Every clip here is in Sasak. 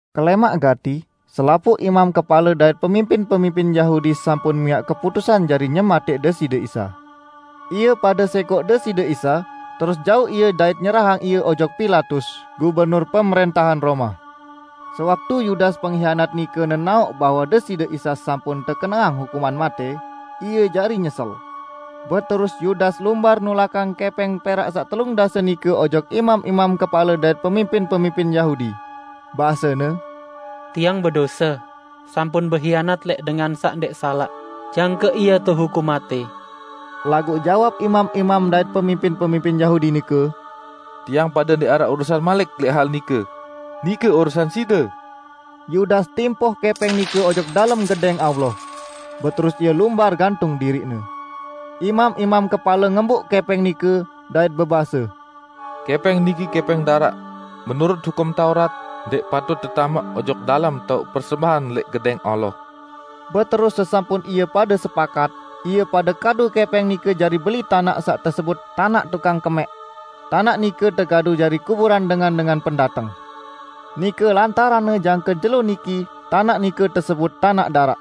Kelẽmaq gati, selapuq imam kepale dait pemimpin-pemimpin Yahudi sampun miaq keputusan jari nyematẽq Deside Isa. Ie pade sẽkoq Deside Isa, terus jauq Ie dait nyerahang Ie ojok Pilatus, gubernur pemrẽntahan Roma. Sewaktu Yudas penghianat nike nenaoq bahwe Deside Isa sampun tekeneang hukuman matẽ, ie jari nyesel. Beterus Yudas lumbar nulakang kẽpẽng perak saq telung dase nike ojok imam-imam kepale dait pemimpin-pemimpin Yahudi. Basene, "Tiang bedose sampun behianat lẽq dengan saq ndẽq salaq jangke Ie tehukum matẽ!" Laguq jawab imam-imam dait pemimpin-pemimpin Yahudi nike, "Tiang pade ndẽq araq urusan malik lẽq hal nike? Nike urusan side!" Yudas timpoh kẽpẽng nike ojok dalem Gedẽng Allah. Beterus ie lumbar gantung diriqne. Imam-imam kepale ngembuq kẽpẽng nike, dait bebase, "Kẽpẽng niki kẽpẽng daraq, menurut Hukum Taurat, ndẽq patut tetamaq ojok dalem taoq persembahan lẽq Gedẽng Allah." Beterus sesampun ie pade sepakat, ie pade kadu kẽpẽng nike jari beli tanaq saq tesebut Tanaq Tukang Kemẽq. Tanaq nike tekadu jari kuburan dengan-dengan pendateng. Nike lantaranne jangke jelo niki tanaq nike tesebut "Tanaq Daraq".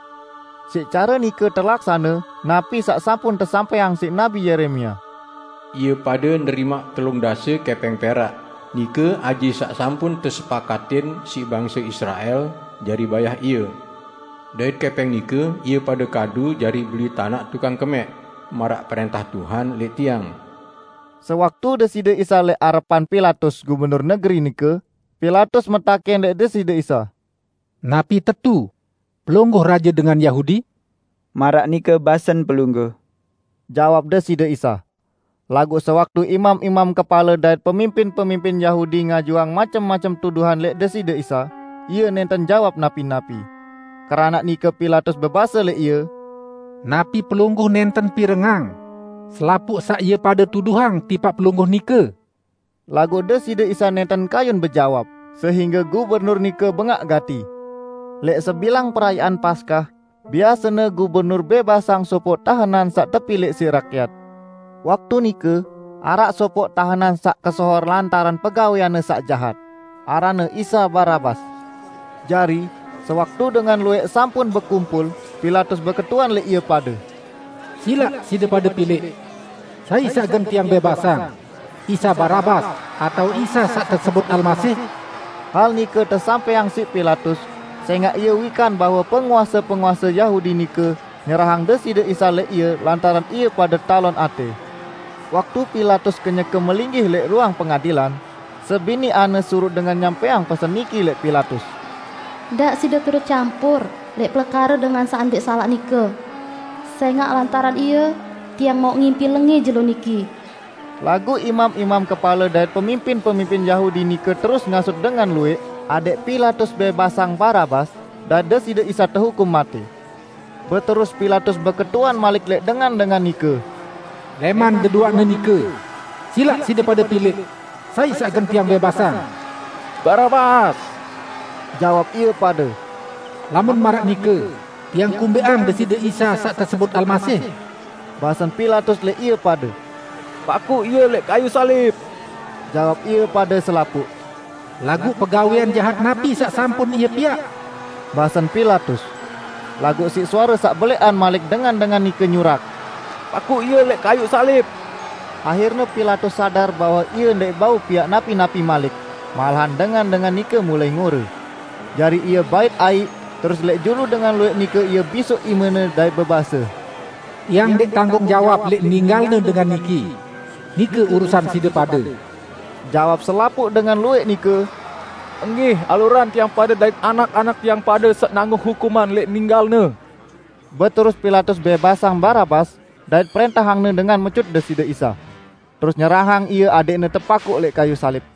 Siq care nike telaksane napi saq sampun tesampẽang siq Nabi Yeremia, "Ie pade nerimaq telung dase kẽpẽng perak, nike aji saq sampun tesepakatin siq bangse Israel jari bayah Ie. Dait kẽpẽng nike ie pade kadu jari beli Tanaq Tukang Kemẽq, maraq prẽntah Tuhan lẽq tiang." Sewaktu Deside Isa lẽq arepan Pilatus, gubernur negeri nike, Pilatus metakẽn lẽq Deside Isa, "Napi tetu Pelungguh raje dengan Yahudi?" "Maraq nike basen pelungguh," jawab Deside Isa. Laguq sewaktu imam-imam kepale dait pemimpin-pemimpin Yahudi ngajuang macem-macem tuduhan lẽq Deside Isa, Ie nẽnten jawab napi-napi. Keranaq nike Pilatus bebase lẽq Ie, "Napi Pelungguh nẽnten pirengang selapuq saq ie pade tuduhang tipaq Pelungguh nike?" Laguq Deside Isa nẽnten kayun bejawab, sehingge gubernur nike bengaq gati. Lẽq sebilang Perayaan Paskah, biasene gubernur bẽbasang sopoq tahenan saq tepilẽq siq rakyat. Waktu nike, araq sopoq tahenan saq kesohor lantaran pegawẽanne saq jahat, aranne Isa Barabas. Jari, sewaktu dengan luwẽq sampun bekumpul, Pilatus beketuan lẽq ie pade, "Silaq side pade pilẽq, sai saq gen tiang bẽbasang: Isa Barabas atao Isa saq tesebut Almasih?" Hal nike tesampẽang siq Pilatus sẽngaq ie wikan bahwe penguase-penguase Yahudi nike nyerahang Deside Isa lẽq ie lantaran ie pade talon atẽ. Waktu Pilatus kenyeke melinggih lẽq ruang pengadilan, sebiniqanne suruq dengan nyampẽang pesen niki lẽq Pilatus, "Ndaq side turut campur lẽq pelekare dengan saq ndẽq salaq nike. Sẽngaq lantaran Ie, tiang mauq ngimpi lengẽ jelo niki." Laguq imam-imam kepale dait pemimpin-pemimpin Yahudi nike terus ngasut dengan luwẽq adẽq Pilatus bẽbasang Barabas dait Deside Isa tehukum matẽ. Beterus Pilatus beketuan malik lẽq dengan-dengan nike, "Lẽman deduaqne nike, silaq side pade pilẽq, sai saq gen tiang bẽbasang?" "Barabas!" jawab ie pade. "Lamun maraq nike tiang kumbẽqang Deside Isa saq tesebut Almasih?" basen Pilatus lẽq ie pade. "Pakuq Ie lẽq kayuq salib!" jawab ie pade selapuq. "Laguq pegawẽan jahat napi saq sampun Ie piaq?" basen Pilatus. Laguq siq suare saq belẽqan malik dengan-dengan nike nyurak, "Pakuq Ie lẽq kayuq salib!" Ahirne Pilatus sadar bahwe ie ndẽq bau piaq napi-napi malik, malahan dengan-dengan nike mulai ngore. Jari ie bait aiq, terus lẽq julu dengan luwẽq nike ie bisoq imene dait bebase, "Tiang ndẽq tanggung jawab lẽq ninggalne dengan niki! Nike urusan side pade!" Jawab selapuq dengan luwẽq nike, "Enggih, alurang tiang pade dait anak-anak tiang pade saq nanggung hukuman lẽq ninggal-Ne!" Beterus Pilatus bẽbasang Barabas, dait prẽntahangne dengan mecut Deside Isa. Terus nyerahang Ie adẽqne tepakuq lẽq kayuq salib.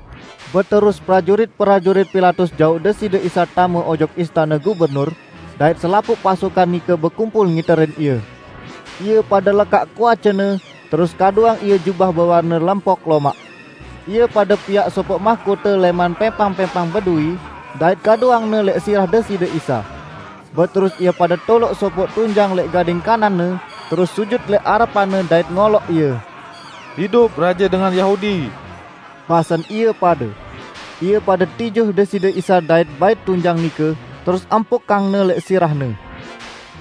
Beterus prajurit-prajurit Pilatus jauq Deside Isa tame ojok istane gubernur, dait selapuq pasukan nike bekumpul ngiterin Ie. Ie pade lekaq kuace-Ne, terus kaduang Ie jubah bewarne lempok lomaq. Ie pade piaq sopoq mahkote lẽman pẽmpang-pẽmpang beduwi, dait kaduangne lẽq sirah Deside Isa. Beterus ie pade toloq sopoq tunjang lẽq gading kanan-Ne, terus sujut lẽq arepan-Ne dait ngoloq Ie. "Idup raje dengan Yahudi!" basen ie pade. Ie pade tijuh Deside Isa dait bait tunjang nike, terus empukangne lẽq sirah-Ne.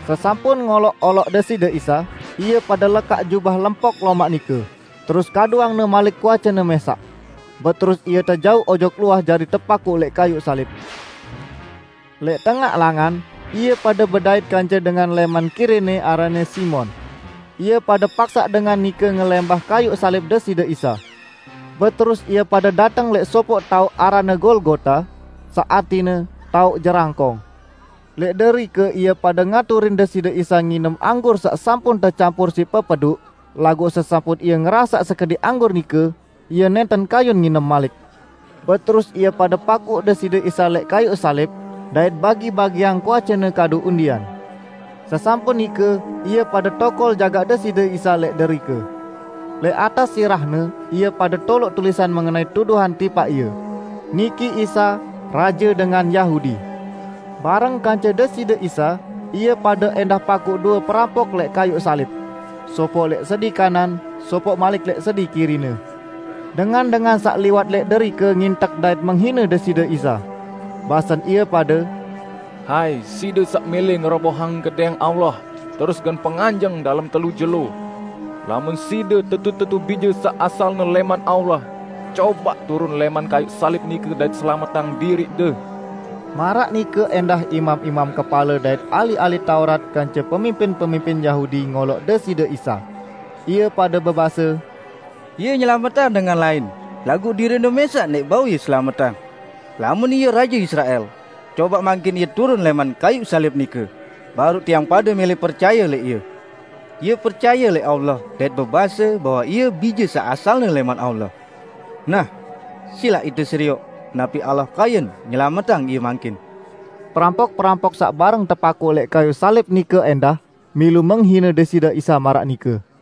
Sesampun ngoloq-oloq Deside Isa, ie pade lekaq jubah lempok lomaq nike, terus kaduangne malik kuace-Ne mẽsaq. Beterus Ie tejauq ojok luah jari tepakuq lẽq kayuq salib. Lẽq tengaq langan, ie pade bedait kance dengan lẽman Kirene aranne Simon. Ie pade paksaq dengan nike ngelẽmbah kayuq salib Deside Isa. Beterus ie pade dateng lẽq sopoq taoq aranne Golgota, saq artine "Taoq Jerangkong". Lẽq derike ie pade ngaturin Deside Isa nginem anggur saq sampun tecampur siq pepeduq, laguq sesampun Ie ngerasaq sekediq anggur nike, Ie nẽnten kayun nginem malik. Beterus ie pade pakuq Deside Isa lẽq kayuq salib dait bagi-bagiang kuace-Ne kadu undian. Sesampun nike, ie pade tokol jagaq Deside Isa lẽq derike. Lẽq atas sirah-Ne ie pade toloq tulisan mengenai tuduhan tipaq Ie: "Niki Isa, Raje Dengan Yahudi". Bareng kance Deside Isa, ie pade ẽndah pakuq due perampok lẽq kayuq salib; sopoq lẽq sedi kanan, sopoq malik lẽq sedi kiri-Ne. Dengan-dengan saq liwat lẽq derike ngintek dait menghine Deside Isa. Basen ie pade, "Hai, Side saq mẽlẽ ngerobohang Gedẽng Allah terus gen penganjeng dalem telu jelo! Lamun Side tetu-tetu Bije saq asalne lẽman Allah, cobaq turun lẽman kayuq salib nike dait selametang diriq-De!" Maraq nike ẽndah imam-imam kepale dait ahli-ahli Taurat kance pemimpin-pemimpin Yahudi ngoloq Deside Isa. Ie pade bebase, "Ie nyelametang dengan lain, laguq diriq-Ne mẽsaq ndẽq bau Ie selametang! Lamun Ie raje Israel, cobaq mangkin Ie turun lẽman kayuq salib nike, baruq tiang pade mẽlẽ percaye lẽq Ie. Ie percaye lẽq Allah dait bebase bahwe Ie Bije saq asalne lẽman Allah. Nah, silaq ite serioq, napi Allah kayun nyelametang Ie mangkin." Perampok-perampok saq bareng tepakuq lẽq kayuq salib nike ẽndah milu menghine Deside Isa maraq nike.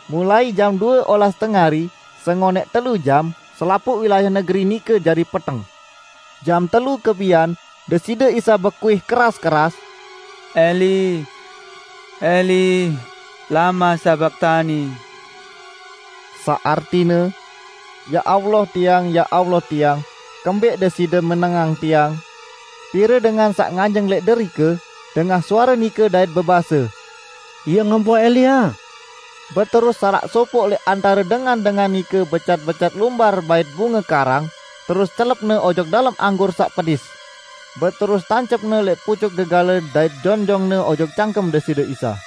Mulai jam due olas tengari, sengonẽq telu jam, selapuq wilayah negeri nike jari peteng. Jam telu kebian, Deside Isa bekuih keras-keras, "Eli, Eli lama sabaktani?" saq artine, "Ya Allah Tiang, ya Allah Tiang, kembẽq Deside menengang Tiang?" Pire dengan saq nganjeng lẽq derike, dengah suare nike dait bebase, "Ie ngempoh Elia!" Beterus salaq sopoq lẽq antare dengan-dengan nike becat-becat lumbar bait bunge karang terus celepne ojok dalem anggur saq pedis, beterus tancepne lẽq pucuk gegale dait jonjongne ojok cangkem Deside Isa.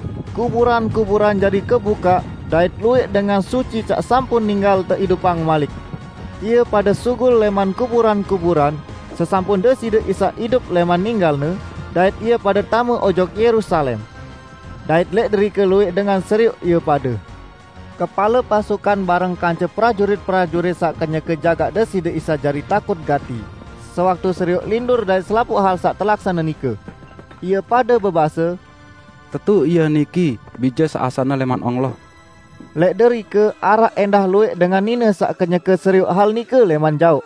Kuburan-kuburan jari kebukaq dait luwẽq dengan suci saq sampun ninggal teidupang malik. Ie pade sugul lẽman kuburan-kuburan sesampun Deside Isa idup lẽman ninggal-Ne dait ie pade tame ojok Yerusalem. Dait lẽq derike luwẽq dengan serioq ie pade. Kepale pasukan bareng kance prajurit-prajurit saq kenyeke jagaq Deside Isa jari takut gati sewaktu serioq lindur dait selapuq hal saq telaksane nike. Ie pade bebase, "Tetu Ie niki Bije saq asalne lẽman Allah!" Lẽq derike araq ẽndah luwẽq dengan nine saq kenyeke serioq hal nike lẽman jaoq.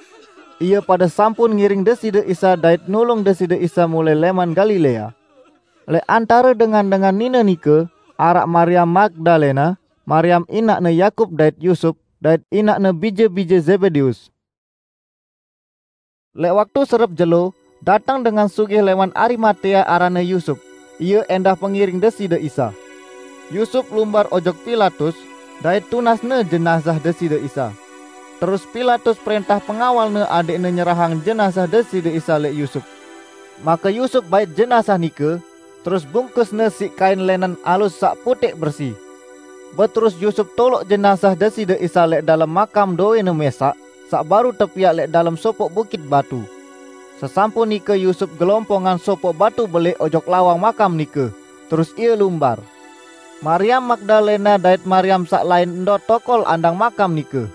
Ie pade sampun ngiring Deside Isa dait nulung Deside Isa mulai lẽman Galilea. Lẽq antare dengan-dengan nine nike, araq Mariam Magdalena, Mariam inaqne Yakub dait Yusup, dait inaqne bije-bije Zebedeus. Lẽq waktu serep jelo dateng dengan sugih lẽman Arimatea aranne Yusup, ie ẽndah pengiring Deside Isa. Yusup lumbar ojok Pilatus dait tunasne jenazah Deside Isa. Terus Pilatus prẽntah pengawalne adẽqne nyerahang jenazah Deside Isa lẽq Yusup. Make Yusup bait jenazah nike, terus bungkusne siq kain lẽnen alus saq putẽq bersi. Beterus Yusup toloq jenazah Deside Isa lẽq dalem makam dowẽne mẽsaq, saq baruq tepiaq lẽq dalem sopoq bukit batu. Sesampun nike Yusup gelompongang sopoq batu belẽq ojok lawang makam nike, terus ie lumbar. Mariam Magdalena dait Mariam saq lain ndot tokol andang makam nike.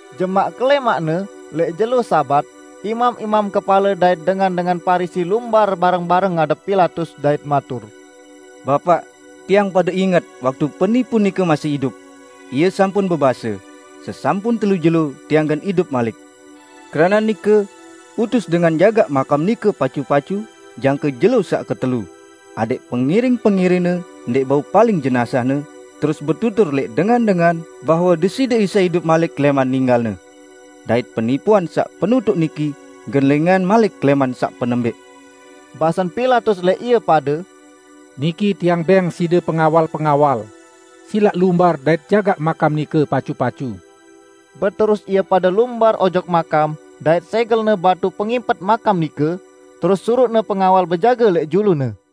Jemaq kelẽmaqne, lẽq jelo Sabat, imam-imam kepale dait dengan-dengan Parisi lumbar bareng-bareng ngadep Pilatus dait matur, "Bapaq, tiang pade inget waktu penipu nike masih idup, Ie sampun bebase, 'Sesampun telu jelo Tiang gen idup malik.' Keranaq nike, utus dengan jagaq makam nike pacu-pacu jangke jelo saq ketelu, adẽq pengiring-pengiring-Ne ndẽq bau paling jenazah-Ne terus betutur lẽq dengan-dengan bahwe Deside Isa idup malik lẽman ninggal-Ne. Dait penipuan saq penutuq niki gen lengẽan malik lẽman saq penembẽq." Basen Pilatus lẽq ie pade, "Niki tiang beng side pengawal-pengawal, silaq lumbar dait jagaq makam nike pacu-pacu." Beterus ie pade lumbar ojok makam, dait sẽgelne batu pengimpet makam nike, terus suruqne pengawal bejage lẽq julune.